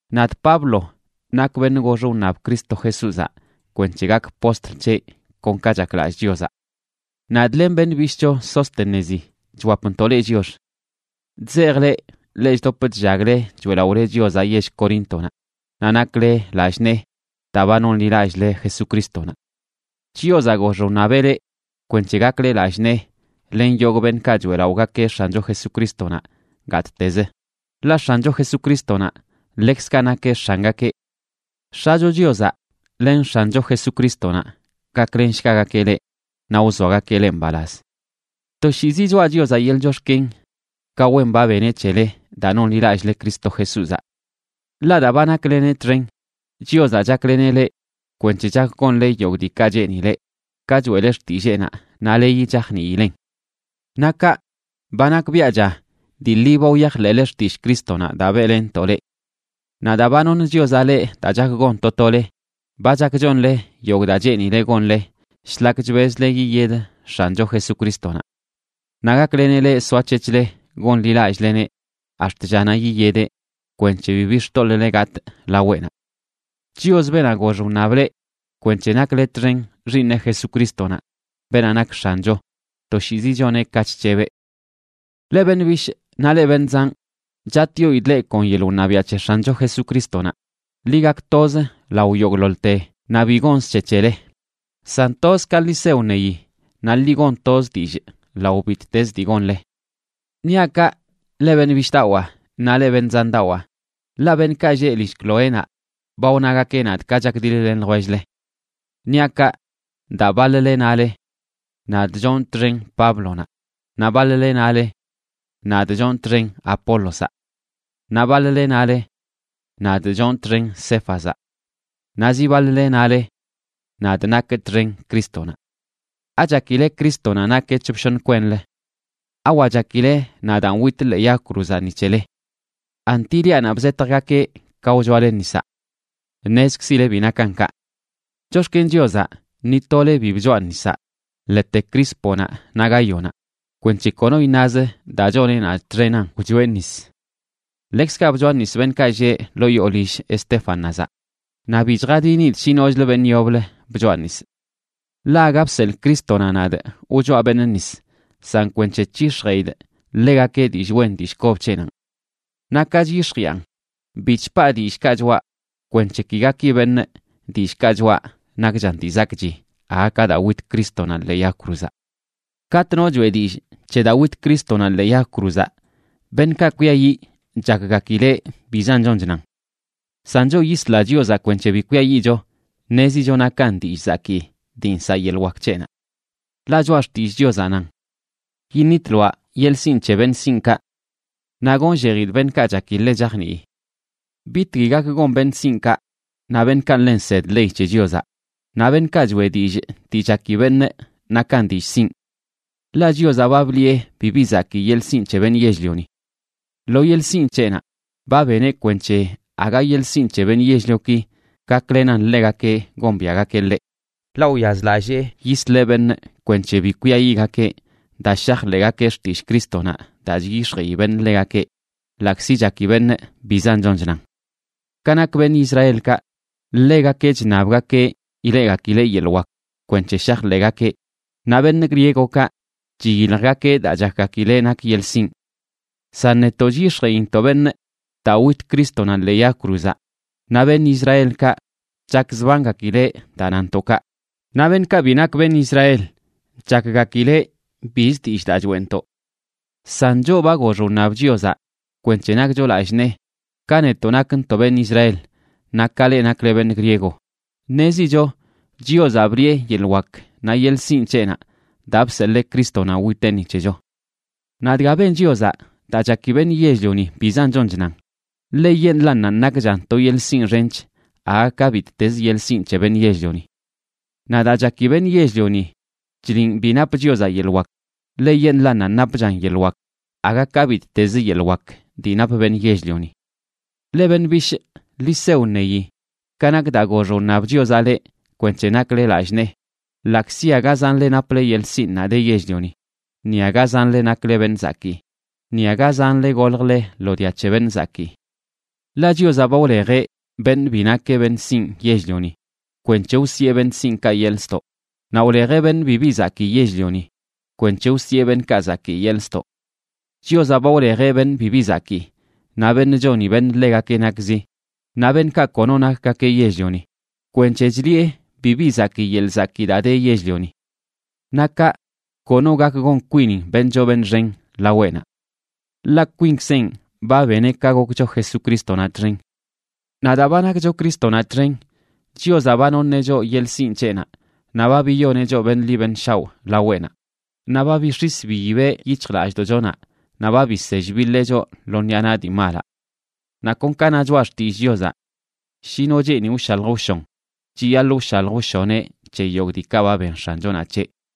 Nadꞌ Pablo nakꞌ beṉꞌ gox wṉab Cristo Jesúzaꞌ kwenc̱he gakꞌ postl c̱heꞌ kon ka chaklallꞌ Chiozaꞌ. Nadꞌ, len beṉꞌ bishꞌcho Sóstenezi, chwapntoꞌ leꞌ chiox. Chzejꞌ leꞌ, leꞌ chdop chllagle choeꞌlaꞌole Chiozaꞌ yell Coríntonaꞌ, naꞌ nakle lallꞌ nee daa ba nonḻilallꞌle Jesucrístonaꞌ. Chiozaꞌ gox wṉabeꞌ leꞌ kwenc̱he gakle lallꞌ nee len yogꞌ beṉꞌkaꞌ choeꞌlaꞌogakeꞌ X̱ancho Jesucrístonaꞌ gattezə, ḻaꞌ X̱ancho Jesucrístonaꞌ ḻekzkaꞌ nakeꞌ X̱angakeꞌ. X̱acho Chiozaꞌ len X̱ancho Jesucrístonaꞌ gaklenshgagakeꞌ leꞌ naꞌ wzoagakeꞌ leꞌ mbalaz. Toshiizi choꞌa Chiozaꞌ yeḻꞌ chox̱ken ka wen ba beneꞌ c̱hele daa nonḻilallꞌle Cristo Jesúzaꞌ. Ḻaꞌ daa ba nakleneꞌ txen, Chiozaꞌ chakleneꞌ leꞌ kwenc̱he chak gonle yogꞌ diikaꞌ cheenileꞌ, ka choeꞌle xtilleenaꞌ naꞌ leyi chajniilen. Naꞌ kaꞌ, ba nakbiaꞌcha dii ḻi ba wyajḻeꞌle xtillꞌ Crístonaꞌ daa beꞌlenntoꞌ leꞌ. Naꞌ daa ba noṉ Chiozaꞌ leꞌ daa chak gon to tole, ba chak chonle yogꞌ daa cheenile gonle shlak chbezle yiyed X̱ancho Jesucrístonaꞌ. Naꞌ gakleneꞌ leꞌ soac̱hec̱hle gonḻilallꞌleneꞌ ax̱t llanaꞌ yiyedeꞌ, kwenc̱he bibi xtoḻꞌle gatꞌ laweꞌnaꞌ. Chios, beenaꞌ gox wṉab leꞌ kwenc̱he nakle txen Xiiṉeꞌ Jesucrístonaꞌ, beenaꞌ nak X̱ancho, toshiizi choneꞌ ka chc̱hebeꞌ. Leꞌ beṉꞌ bishꞌ naꞌ leꞌ beṉꞌ zanꞌ, chatꞌyoidꞌ leꞌ kon yeḻꞌ wṉabiaꞌ c̱he X̱ancho Jesucrístonaꞌ, ḻi gak toz lao yogꞌḻoḻte naꞌ bi gonzə c̱he c̱hele, san toz ka ḻi se wṉeyi naꞌ ḻi gon toz dillꞌ lao bittezə dii gonle. Niaꞌ kaꞌ, leꞌ beṉꞌ bishꞌdawaa naꞌ leꞌ beṉꞌ zandawaa, ḻaꞌ beṉꞌkaꞌ lleꞌ lill Cloénaꞌ ba wnagakeꞌ nadꞌ ka chakdiḻ-len ljwell-le. Niaꞌ kaꞌ, daa baḻ-le nale: “Nadꞌ chonꞌ txen Páblonaꞌ”, naꞌ baḻ-le nale: “Nadꞌ chonꞌ txen Apólozaꞌ.” Naꞌ baḻ-le nale: “Nadꞌ chonꞌ txen Céfazaꞌ.”a Naꞌ zi baḻ-le nale: “Nadꞌ nakꞌ txen Crístonaꞌ.” ¿Achakileꞌ Crístonaꞌ nakeꞌ c̱hop shoṉ kwenlə? ¿Awa chakile nadaan witꞌ ḻee yag cruzaꞌ ni c̱heleꞌ? ¿Anti liaꞌnaꞌ bzetjgakeꞌ ka wchoale nisaꞌ? Ṉezkzile bi nakan kaꞌ. Chox̱ken Chiozaꞌ ni tole bi bchoaꞌ nisaꞌ, ḻete Crísponaꞌ naꞌ Gáyonaꞌ, kwenc̱he kono iṉazə daa choneꞌ nadꞌ txenan wchoeꞌ nis. Ḻekzkaꞌ bchoanisꞌ beṉꞌkaꞌ lleꞌ ḻoo yoo lill Estéfanazaꞌ, naꞌ bi chjadinidꞌ shi nochlə beṉꞌ yoblə bchoanisꞌ. Ḻaꞌ aga bseḻꞌ Crístonaꞌ nadꞌ wchoaꞌ beṉꞌ nis, san kwenc̱he c̱hix̱jeꞌidꞌ ḻegakeꞌ dillꞌ wen dillꞌ kob c̱heꞌnanꞌ. Naꞌ ka chyix̱jiꞌan, bi chpaa dillꞌkaꞌ choꞌa kwenc̱he ki gaki beṉꞌ dillꞌkaꞌ choꞌa nakchan dii zakꞌchi aga ka daa wit Crístonaꞌ ḻee yag cruzaꞌ. Katꞌ no choꞌe dillꞌ c̱he daa wit Crístonaꞌ ḻee yag cruzaꞌ, beṉꞌkaꞌ kwiayiꞌ chakgakileꞌ bizan chon chnan. San choꞌ yisla Chiozaꞌ kwenc̱he bi kwiayiꞌcho, ṉezicho nakan dillꞌ zakii dii nsaꞌ yeḻꞌ wak c̱heꞌnaꞌ. Ḻaꞌ Choꞌa Xtillꞌ Chiozaꞌ nan: Yiṉitloaꞌ yeḻꞌ sinꞌ c̱he beṉꞌ sinꞌkaꞌ. Naꞌ gonllejidꞌ beṉꞌkaꞌ chaki ḻe chajnii. ¿Bitgui gak gon beṉꞌ sinꞌkaꞌ naꞌ beṉꞌkaꞌ ḻe nsed ley c̱he Chiozaꞌ, naꞌ beṉꞌkaꞌ choeꞌ dillꞌ dii chaki beṉꞌ nakan dillꞌ sinꞌ? Ḻaꞌ Chiozaꞌ ba bliꞌe bibi zakii yeḻꞌ sinꞌ c̱he beṉꞌ yell-lioni. Lo yeḻꞌ sinꞌ c̱heꞌnaꞌ, ba beneꞌ kwenc̱he aga yeḻꞌ sinꞌ c̱he beṉꞌ yell-lioki gaklenan ḻegakeꞌ gombiaꞌgakeꞌ ḻeꞌ. Ḻaꞌ wyazlallee yisleꞌ beṉꞌ kwenc̱he bi kwiayiꞌgakeꞌ daa shajḻeꞌgakeꞌ xtillꞌ Crístonaꞌ daa chyix̱jeꞌi beṉꞌ ḻegakeꞌ, ḻaꞌkzi chaki beṉꞌ bizan chon chnan. Ka nak beṉꞌ Israelkaꞌ, ḻegakeꞌ chṉabgakeꞌ ileꞌgakileꞌ yeḻꞌ wak kwenc̱he shajḻeꞌgakeꞌ, naꞌ beṉꞌ griegokaꞌ chiyiljgakeꞌ daa chakgakileꞌ nak yeḻꞌ sinꞌ. San netoꞌ chyix̱jeꞌintoꞌ beṉꞌ daa wit Crístonaꞌ ḻee yag cruzaꞌ, naꞌ beṉꞌ Israelkaꞌ chakzbangakileꞌ daa nantoꞌ kaꞌ, naꞌ beṉꞌkaꞌ bi nak beṉꞌ Israel chakgakileꞌ biz dillꞌ daa choeꞌntoꞌ. San choꞌ ba gox wṉab Chiozaꞌ kwenc̱he nakcho lallꞌ nee, ka netoꞌ nakntoꞌ beṉꞌ Israel naꞌ ka leꞌ nakle beṉꞌ griego, ṉezicho Chiozaꞌ bliꞌe yeḻꞌ wak naꞌ yeḻꞌ sinꞌ c̱heꞌnaꞌ daa bseḻee Crístonaꞌ witeꞌ ni c̱hecho. Naꞌ dga ben Chiozaꞌ daa chaki beṉꞌ yell-lioni bizan chon chnan, ḻeyeṉꞌlannanꞌ nakchan to yeḻꞌ sinꞌ xench aga ka bittezə yeḻꞌ sinꞌ c̱he beṉꞌ yell-lioni. Naꞌ daa chaki beṉꞌ yell-lioni chliꞌn bi nap Chiozaꞌ yeḻꞌ wak, ḻeyeṉꞌlannanꞌ napchan yeḻꞌ wak aga ka bittezə yeḻꞌ wak dii nap beṉꞌ yell-lioni. Leꞌ beṉꞌ bishꞌ, ḻi se wṉeyi ka nak daa gox wṉab Chiozaꞌ leꞌ kwenc̱he nakle lallꞌ nee ḻaꞌkzi aga zanle naple yeḻꞌ sinꞌnaꞌ de yell-lioni, ni aga zanle nakle beṉꞌ zakii, ni aga zanle goljle lo dia c̱he beṉꞌ zakii. Ḻaꞌ Chiozaꞌ ba wlejeꞌ beṉꞌ bi nakeꞌ beṉꞌ sinꞌ yell-lioni kwenc̱he wsiꞌe beṉꞌ sinꞌkaꞌ yeḻꞌ ztoꞌ, naꞌ wlejeꞌ beṉꞌ bibi zakii yell-lioni kwenc̱he wsiꞌe beṉꞌkaꞌ zakii yeḻꞌ ztoꞌ. Chiozaꞌ ba wlejeꞌ beṉꞌ bibi zakii, naꞌ beṉꞌ choni beṉꞌ ḻegakeꞌ nakzi, naꞌ beṉꞌkaꞌ kono nakgakeꞌ yell-lioni, kwenc̱he chliꞌe bibi zakii yeḻꞌ zakii daa de yell-lioni. Naꞌ kaꞌ, kono gak gon kwinin beṉꞌ choo beṉꞌ xen laweꞌnaꞌ. Ḻaꞌ kwinkzenꞌ ba beneꞌ ka gokcho Jesucrístonaꞌ txen. Naꞌ daa ba nakcho Crístonaꞌ txen, Chiozaꞌ ba noṉeꞌ choꞌ yeḻꞌ sinꞌ c̱heꞌnaꞌ, naꞌ ba biyoneꞌ choꞌ beṉꞌ ḻi beṉꞌ shaoꞌ laweꞌnaꞌ, naꞌ ba bix̱is biyibeꞌ yic̱hjlallꞌdoꞌchonaꞌ naꞌ ba bisell biḻee choꞌ lo ṉiꞌa naꞌ dii malaꞌ. Naꞌ kon ka na Choꞌa Xtillꞌ Chiozaꞌ: “Shi no cheeni wshalj wshon, chiyaḻꞌ wshalj wshoneꞌ c̱he yogꞌ diikaꞌ ba ben X̱anchonaꞌ c̱heꞌ.”